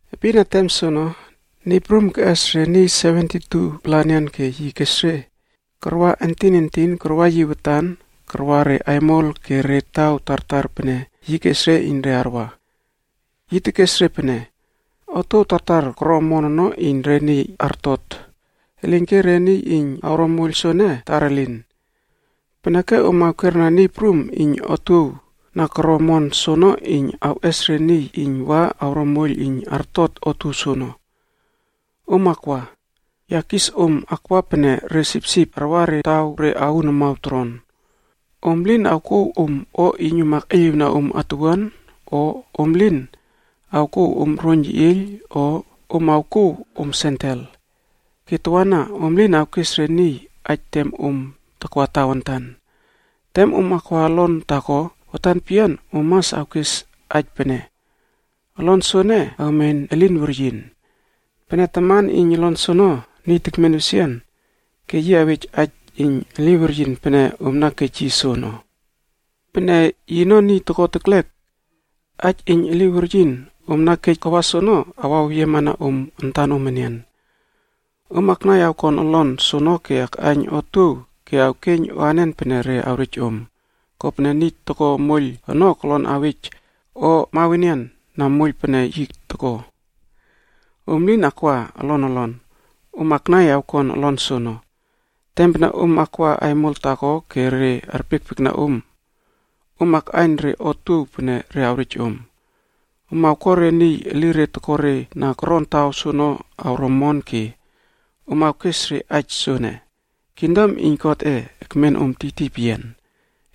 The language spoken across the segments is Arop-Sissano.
Epin na tem soono, Niy Prum keꞌes re niy 72-pla enian ke yi kes re karwa entin entin karwa yi watan karwa re aimol ke re taw tartar pene yi kes iyn re arwa. Yi tekes re pene, “Otuow tartar koro omon ono iyn re niy artot, elinke re niy iyn awro moiyl soene, tar elin. Peneke om awkera Niy Prum iyn otuow na koro omon soono iyn awꞌes re niy iyn wa awro moiyl iyn artot otuow soono. Om akwa! Ya kis om akwa pene re sipsip arwa re taw re aun amaw toron. Om lin awkouw om o iyn om akꞌeiyliwna om atuwuan, o om lin awkouw om roiyn yeꞌieyl o om awkouw om sendel. Ke tawana om lin awkes re niy aij tem om takwa tawantan. “Tem om akwa olon taako, watan peyian om mas awkes aij pene, ‘Olon soene awmen elin weryin.’ Pene taman iyn olon soono niy tekmen wesian, ke yi awej aij iyn eli weryin pene om na kej yi soono. Pene yino niy toko teklek, aij iyn eli weryin om na kej kawa soono awaweyiema na om antanom enian. Om aknai awkon olon soono ke akꞌaiyn otuow ke awkeiyn o anen pene re awrej om, kopene niy toko moiyl ono kolon awej o mawenian na moiyl pene yi toko. Om lin akwa olon olon, om aknai awkon olon soono. “Tem pene om akwa aimol taako ke re arpiekpiekna om, om akꞌaiyn re otuow pene re awrej om. Om awko re niy elire toko re na koron taw soono awro omon ke om awkes re aij soene, ‘kingdom iyn Godꞌe ekmen om tiytiy peyian.’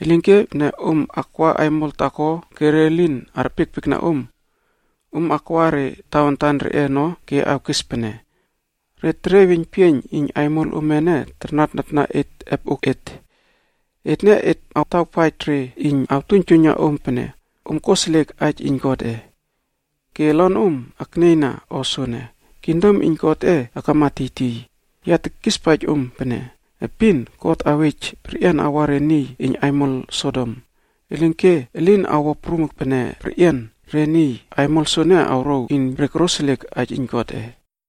Elinke pene om akwa aimol taako ke re lin arpiekpiekna om, om akwa re tawantan reꞌe ono ke awkes pene, ‘Re teriey weiynpieiyn iyn aimol ome ene tarnatnatna et epoꞌok et, ene et atawpaij re iyn awtuiyna om pene om koseliek aij iyn Godꞌe. Ke olonom aknieyna o soene, kingdom iyn Godꞌe akama tiytiy.’ Ya tekispaij om pene, epin God awej perꞌian awa re niy iyn aimol Sodom,a elinke elin awo prum pene perꞌian re niy iyn aimol soene awrouw iyn re koroseliek aij iyn Godꞌe.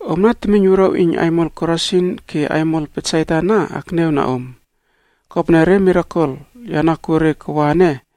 “Omna temiyn wuruaw iyn aimol Korasin ke aimol Betsaida ana akniawna om. Kopene, re mirakel ya na kuo re kawa ene,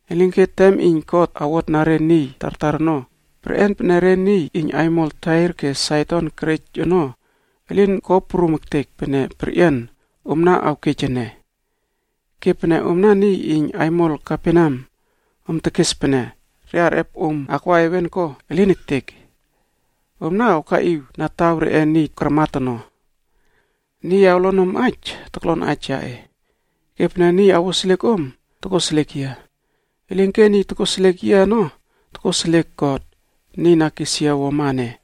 Elinke tem iyn God awotna re niy tartar ono, perꞌian pene re niy iyn aimol Tair ke Saidon kerej ono elin ko prum ektek pene perꞌian omna awkej ene. Ke pene omna niy iyn aimol Kaperneam, om tekes pene re arꞌep om akwa heven, ko? Elin ektek! Omna awkaꞌiw na taw reꞌe niy karmat ono. “Niy awlon om aij, toklon aij yaꞌe, ke pene niy awoseliek om, tokoseliek yia. Elinke niy tokoseliek yia ono, tokoseliek God, niy na kes yia wuama ene.”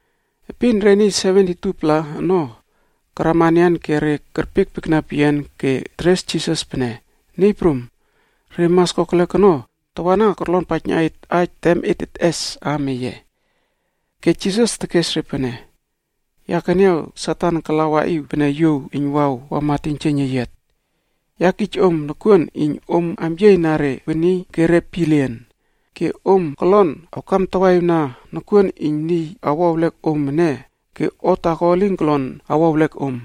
Epin re niy 72-pla ono karama enian ke re kerpiekpiekna peyian ke teres Jisas pene, “Niy Prum, re mas kokelek ono tawana korlonpaijna et aij tem et teꞌes aam eye.” Ke Jisas tekes re pene, “Ya keniaw Satan kala waꞌiw pene yuow eiynwaw wama teiynjieiyn eyiat. Ya kij om nokuon iyn om amyiey na re weni ke re pielien, ke om kolon awkamtawaꞌiwna nokuon iyn niy awo ewlek om ene ke o taako elin kolon awo ewlek om.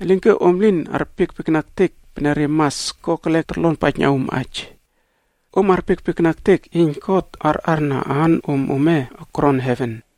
Elinke om lin arpiekpiekna ektek pene re mas kokelek torlonpaijna om aij, om arpiekpiekna ektek iyn God arꞌarna aanom ome koron heven.”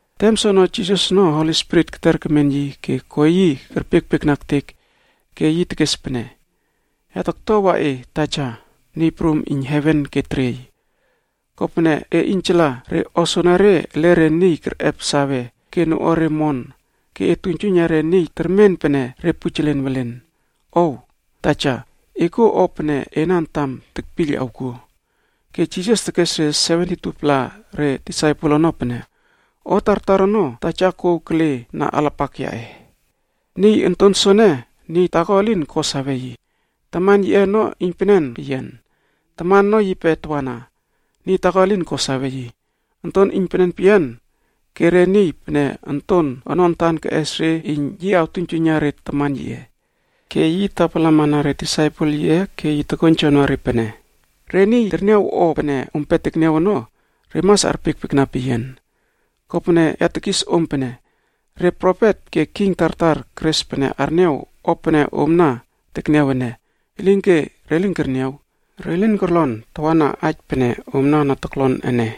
Tem soono Jisas ono Holi Spirit keter kemen yi ke ko yi kerpiekpiekna ektek ke yi tekes pene, “Ya taktuawa e Taja, Niy Prum iyn heven ke teriey, kopene e iynjala re o soenere ele re niy kerꞌep sawe ke noꞌuare omon ke e tuiynjuiyna re niy termen pene re pujelen welen. Ow! Taja e kuo o pene ena antam tekpiyl awkuo.” Ke Jisas tekes re 72-pla re disaipel ono pene, “O tartar ono Taja kouw kele na alapak yaꞌe. Niy Onton soene, niy taako elin ko sawe yi, Taman yiꞌe ono iynpenen peyian. Taman ono yipe tawana, niy taako elin ko sawe yi, Onton iynpenen peyian ke re niy pene onton ono antan keꞌes re iyn yi awtuiynjuiyna re Taman yiꞌe.” Ke yi tapalamana re disaipel yiꞌe ke yi tokoiynjowna re pene, “Re niy terniaw o pene ompe tekniaw ono, re mas arpiekpiekna peyian. Kopene ya tekis om pene, re profet ke king tartar keres pene arniaw o pene omna na tekniaw ene, elinke re lin kerniaw. Re lin korlon tawana aij pene omna na toklon ene.”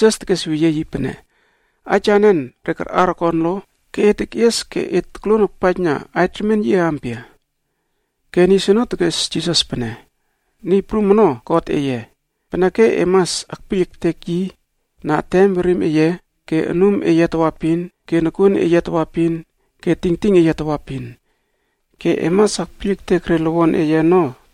Ke Jisas tekes weyie yi pene, “Aij anen re karꞌar okon lo? Ke e tekꞌies ke e tokluon akpaijna aij remien yiꞌe ampia?” Ke niy soono tekes Jisas pene, “ ‘Niy Prum ono God eye, peneke om mas akpiyl ektek yi na etenom werinom ome ke anumom ome tawaepin ke nokuon ome tawaepin ke tingting ome tawaepin.d Ke ‘Om mas akpiyl ektekma re niy elen ono,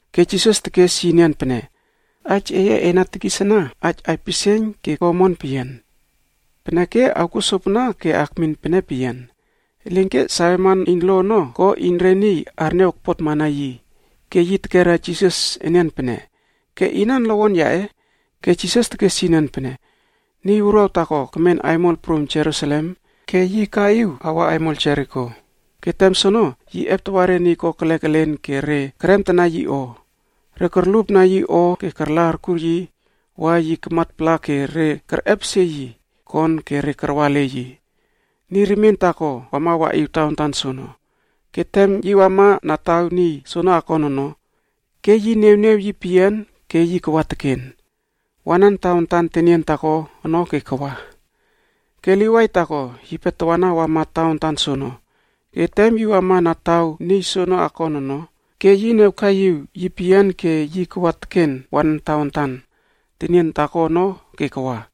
Ke Jisas tekes yi enian pene, “Aij eye e na tekis ana aij aipisieiyn ke omon peyian. Peneke, awkuo sopana ke e akmin pene peyian.” Elinke saweman iyn lo ono ko iyn re arniaw okpotmana yi ke yi tekera Jisas enian pene, “Ke inan lowon yaꞌe?” Ke Jisas tekes yi enian pene, “Niy wuruaw taako kemen aimol prum Jerusalem ke yi akaꞌiw awa aimol Jeriko, ke tem soono, yi eptawa re niy kokelek elen ke re keremtana yi o. Re korlupna yi o ke karla arkur yi wa yi kamatpala ke re kerꞌepesie yi kon ke re karwa ele yi. Niy remien taako wama waꞌiw tawantan soono, ke tem yi wama na taw niy soono akon ono, ke yi niawiw yi peyian ke yi kawa teken, wanan tawantan tenien taako ono ke kawa. “Ke Livaif taako yipe tawana wama tawantan soono ke tem yi wama na taw niy soono akon ono, ke yi niawkaiꞌiw yi peyian ke yi kawa teken wanan tawantan tenien taako ono ke kawa.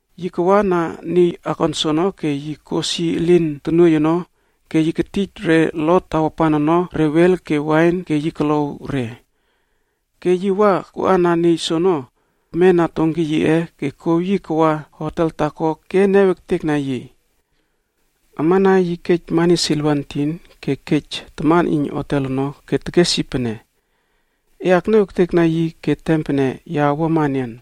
Yi kawa na niy akon soono ke yi kos yi elin tonuoiy ono ke yi ketij re lot tawapan ono re wel ke wain ke yi kolow re. Ke yi wa koana niy soono kemena donki yiꞌe ke kouw yi kawa hotel taako ke niaw ektekna yi. Amana yi kej mani siliva entinh ke yi kej taman iyn hotel ono ke yi tekes yi pene, ‘E akniawtek yi ke tem pene ya awuama enian,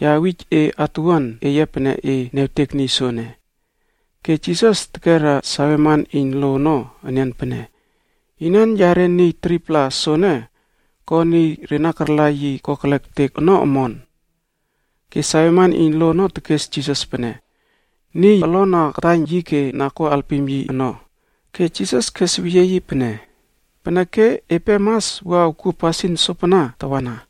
ya awij e atuwuan eye pene e niawtek niy soene.’” Ke Jisas tekera saweman iyn lo ono enian pene, “Inan yare niy 3-pla soene ko niy re na karla yi kokelek ektek ono omon?” Ke saweman iyn lo ono tekes Jisas pene, “Niy olon na kataiyn yi ke na ko alpim yi ono.” Ke Jisas kes weyie yi pene, “Peneke epe mas wua awkuo pasin sopana tawana.”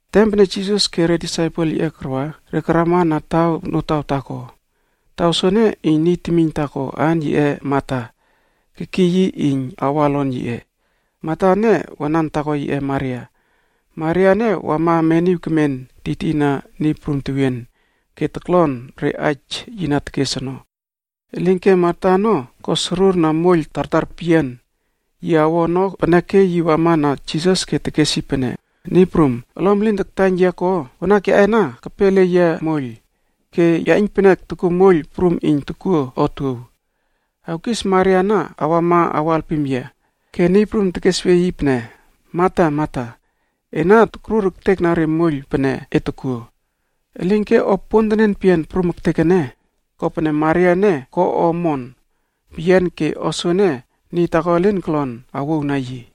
Tem pene Jisas ke re disaipel yiꞌe karwa, re karama na taw notaw taako. Taw soono niy temiyn taako aan yiꞌe Mata kekiy yi iyn awa olon yiꞌe. Mata ene wanan taako yiꞌe Maria. Maria ene wama meniw kemen tiytiyna Niy Prum tewien ke toklon re aij yi na tekes ono. Elinke Mata ono ko sorur na moiyl tartar peyian yi awo ono peneke yi wama na Jisas ke tekes yi pene, “Niy Prum, olom elin taktaiyn yia ko? Wanak yaꞌe ana kepe ele yia moiyl. Ke ya iynpenek tokuo moiyl prum iyn tokuo otuow. Awkis Maria ana awama awo alpim yia.” Ke Niy Prum tekesweyie yi pene, “Mata, Mata, ena tokrur ektekna re moiyl pene e tokuo. Elinke o pontenen peyian prum ektek ene, kopene Maria ene ko o omon peyian ke o soene niy taako elin kolon awouwna yi.”